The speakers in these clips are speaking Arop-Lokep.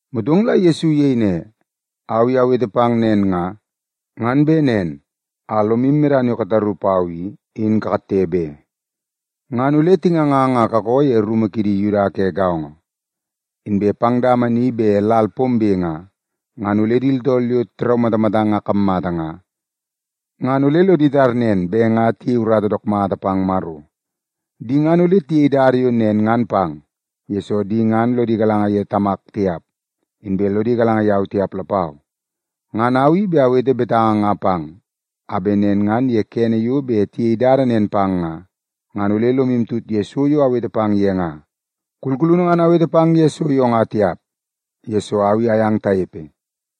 Motong la Yesu iyei ne, “Au i awete pang nen nga, ngan bet nen a lomu medana yo kataru pau i, in katte be. Ngan ole tingangang a kakoo ye rumu kidi Yuda ke gaongo. Inbe pang dama ni bet lal pombe nga, ngan ole di tooltool yo tiraumatamatang a kammata nga, ngan ole lodi tar nen bet nga tiyei urata dook mata pang Maro. Di ngan ole tiyei dada yo nen ngan pang, yesoo di ngan lodi galanga ye Tamak tiap, inbe lodi galanga yau tiap lapau. Ngan au i bet awete betanga nga pang, a bet nen ngan ye kene yo bet tiyei dada nen pang nga, ngan ole lomu tut ye so yo awete pang ye nga. Kulkulunu ngan awete pang ye so yo nga tiap, yesoo au i ayang tanepe.”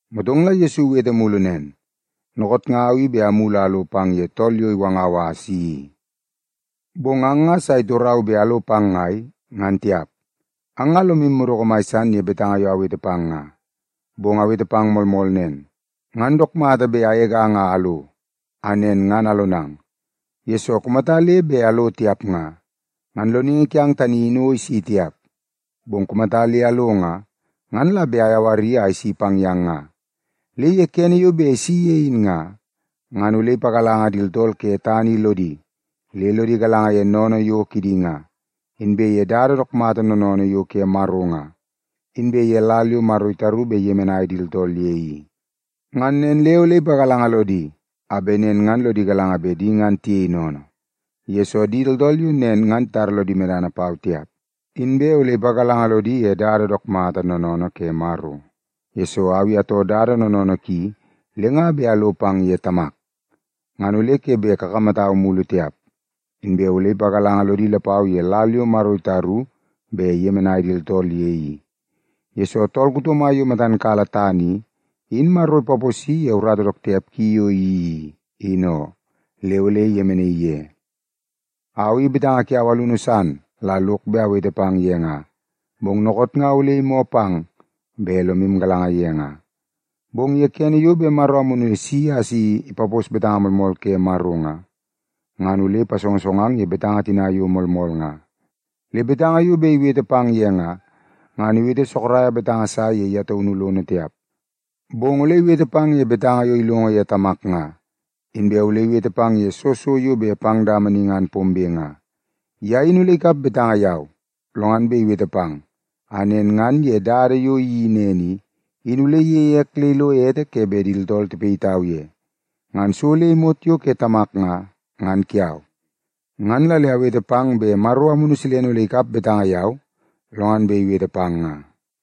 Motong la Yesu iwete mulu nen, “Dookoot nga au i bet amulu a alo pang ye tool tani yo iwangau a asi i, bong ang nga sa itorau bet alo pang ngai, ngan tiap. Ang nga lomu madoko mai san ye betanga yo awete pang nga. Bong awete pang moolmool nen, ngan dook mata bet agegang a alo, a nen ngan alonang. Yesoo, kumata le bet alo tiap nga, ngan Loningi kiang tani in o isi tiap. Bong kumata le alo nga, ngan la bet ayawari a isi pang yang nga. Le ye kene yo bet isi ye in nga, ngan ole ipagalanga di tooltool ke tana i lodi, le lodi galanga ye sennene yo kidi nga, inbe ye dada dook mata noonoonoo yo ke Maro nga, inbe ye lal yo Maro itaru bet iyemenai di tooltool ye i. Ngan nen le ole ipagalanga lodi a bet nen ngan lodi galanga bet di ngan tiyei sennene, yesoo di tooltool yo nen ngan titara lodi medana pau tiap. Inbe ole ipagalanga lodi ye dada dook mata noonoonoo ke Maro, yesoo au i atoo dada noonoonoo ki le nga bet alo pang ye Tamak, ngan ole ke bet kakamatau mulu tiap. Inbe ole ipagalanga lodi lapau ye lal yo Maro itaru bet iyemenai di tooltool ye i, yesoo tool kuto mai yo matan kala tana i, in Maro ipaposi ye urata dook tiap ki yo iyeii i, in oo, le ole iyemenaii ye. “Au i betanga kiau alunu san la lok bet awete pang ye nga, bong dookoot nga ole imoo pang bet lomu galanga ye nga. Bong ye kene yo bet Maro Amunu bet isi a si ipapos betanga moolmool ke Maro nga, ngan ole ipasongosongang ye betanga tina yo moolmool nga. Le betanga yo bet iwete pang ye nga, ngan iwete sorok sa ye ye taunu lono tiap, bong ole iwete pang ye betanga yo ilongo ye Tamak nga, inbe ole iwete pang ye soo so yo bet pang dama ni ngan pombe nga. Ye in ole ikap betanga yau, lo ngan bet iwete pang, a nen ngan ye dada yo iyeii nen i, in ole iyeie ek le ilo ete ke bet di tooltool tipayitau ye. Ngan so le imot yo ke Tamak nga, ngan kiau. Ngan la le awete pang bet Maro Amunu ole ikap betanga yau, lo ngan bet iwete pang nga.”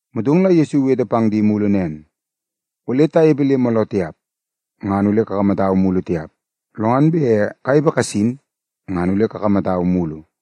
Motong la Yesu iwete pang di mulu nen, “Ole tanepe le mooloo tiap, ngan ole kakamatau mulu tiap. Lo ngan bet kanepe kasin, ngan ole kakamatau mulu.”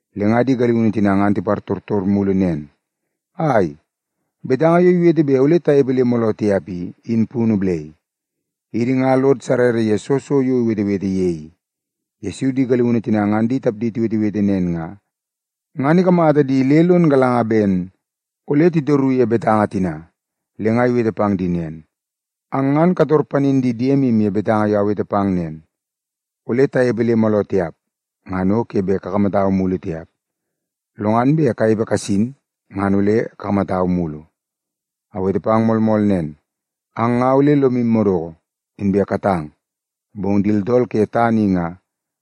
Le nga di galiunu tina ngan tipartortor mulu nen, “Ai, betanga yo iwete bet ole tanepe le mooloo tiap i, in punu balai? Idi nga lod sarrara ye soo so yo iwetewete ye i.” Yesu di galiunu tina ngan di tapdi tiwetewete nen nga, ngan ikamata di le lon galanga ben ole titoru ye betanga tina. Le nga iwete pang di nen, “Ang ngan kator panin di diemu ye betanga yo awete pang nen, ‘Ole tanepe le mooloo tiap, ngan o ke bet kakamatau mulu tiap. Lo ngan bet kanepe kasin, ngan ole kakamatau mulu.’ Awete pang moolmool nen, ang nga ole lomu madoko, inbe katang, bong di tooltool ke tana i nga,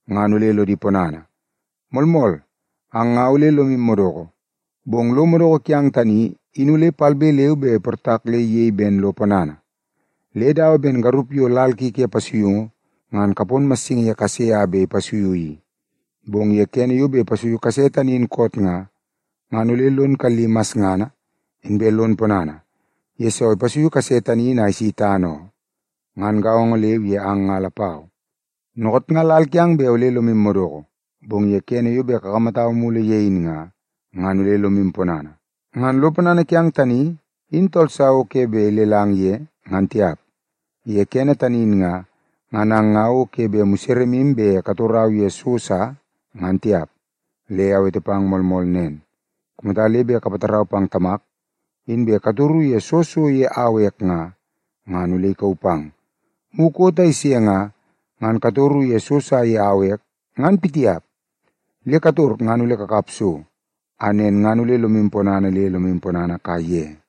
ngan ole lodi ponana. Moolmool, ang nga ole lomu madoko, bong lo madoko kiang tani in ole palbe leu be iportak le iyei ben lo ponana. Le dawa ben garup yo lal ki ke pasuiungu ngan kapon massingi ye kase a bet ipasuiu i. Bong ye kene yo bet ipasuiu kase tani in koot nga, ngan ole lon kalli masngana, inbe lon ponana, yesoo ipasuiu kase tani in a isi tana oo. Ngan gaongo leu ye ang nga lapau. Dookoot nga lal kiang bet ole lomu madoko, bong ye kene yo bet akamatang mulu ye in nga, ngan ole lomu ponana. Ngan lo ponana kiang tani in tool sa o ke bet ilelang ye, ngan tiap. Ye kene tani in nga, ngan ang nga o ke bet museremu bet katorau ye so sa, ngan tiap. Le awete pang moolmool nen, kumata le bet kapatarau pang Tamak, inbe katoru ye soo so ye au ek nga, ngan ole ikauu pang. Mukot a ise nga, ngan katoru ye so sa ye au ek, ngan pitiap. Le kator ngan ole kakap so, a nen ngan ole lomu ponana le lomu ponana kaiye.”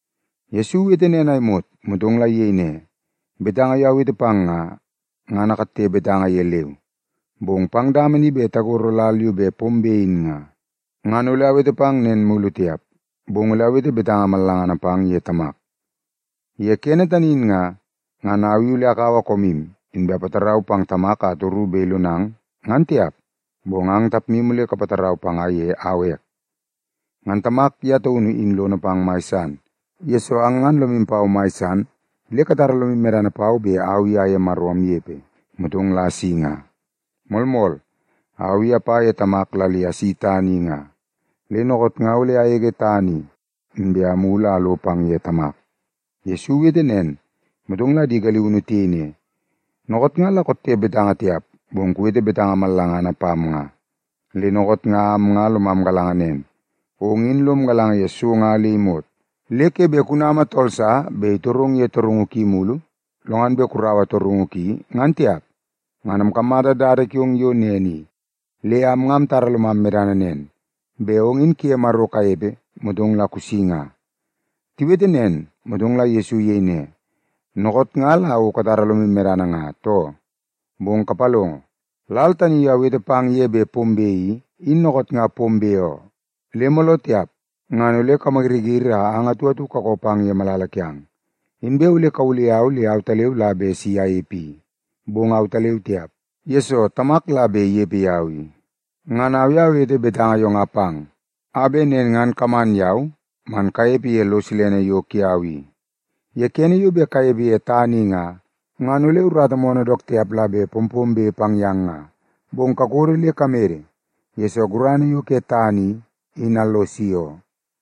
Yesu iwete nen a imot, motong la iyei ne, “Betanga yo awete pang nga, ngan akatte betanga ye leu. Bong pang dama ni bet tagoro lal yo bet pombe in nga, ngan ole awete pang nen mulu tiap, bong ole awete betanga mallangana pang ye Tamak. Ye kene tani in nga, ngan au i ole akaua koomu, inbe apatarau pang Tamak a atoru bet ilonang, ngan tiap, bong ang tapmu ole kapatarau panga ye au ek. Ngan Tamak ye taunu in lono pang mai san, yesoo ang ngan lomu pau mai san le katara lomu medana pau bet au i aye Maro amnepe, motong la asi nga. Moolmool, au i apa ye Tamak la le asi tana i nga, le dookoot nga ole agege tana i, inbe amulu a alo pang ye Tamak.” Yesu iwete nen, motong la di galiunu tiyei ne, “Dookoot nga la kotte betanga tiap, bong kuwete betanga mallangana pam nga. Le dookoot nga am nga lomam galanga nen, ong in lom galanga ye so nga le imot. Le ke bet kunama tool sa bet itorong ye torungu ki mugu, lo ngan bet kuraua torungu ki, ngan tiap. Ngan amkamata dada kiong yo nen i, le am nga amtara lomam medana nen, bet ong in kuye Maro kanepe, motong la kusi nga.” Tiwete nen, motong la Yesu iyei ne, “Dookoot nga la o katara lomu medana nga, too? Bong kapalongo, lal tani yo awete pang ye bet pombe i, in dookoot nga pombe oo. Le mooloo tiap ngan ole kamayiriyiri a ang atu atu kakoo pang ye malala kiang. Inbe ole kawulai yau le autaleu la bet si anepe i. Bong autaleu tiap, yesoo Tamak la bet inepe yau i. Ngan au i awete betanga yo nga pang, a bet nen ngan kaman yau man kanepe ye lo silene yo kiau i. Ye kene yo bet kanepe ye tana i nga, ngan ole urata moonoo dook tiap la bet pompombe pang yang nga. Bong kakodo le kamede, yesoo gurana yo ke tana i, in allosi oo.”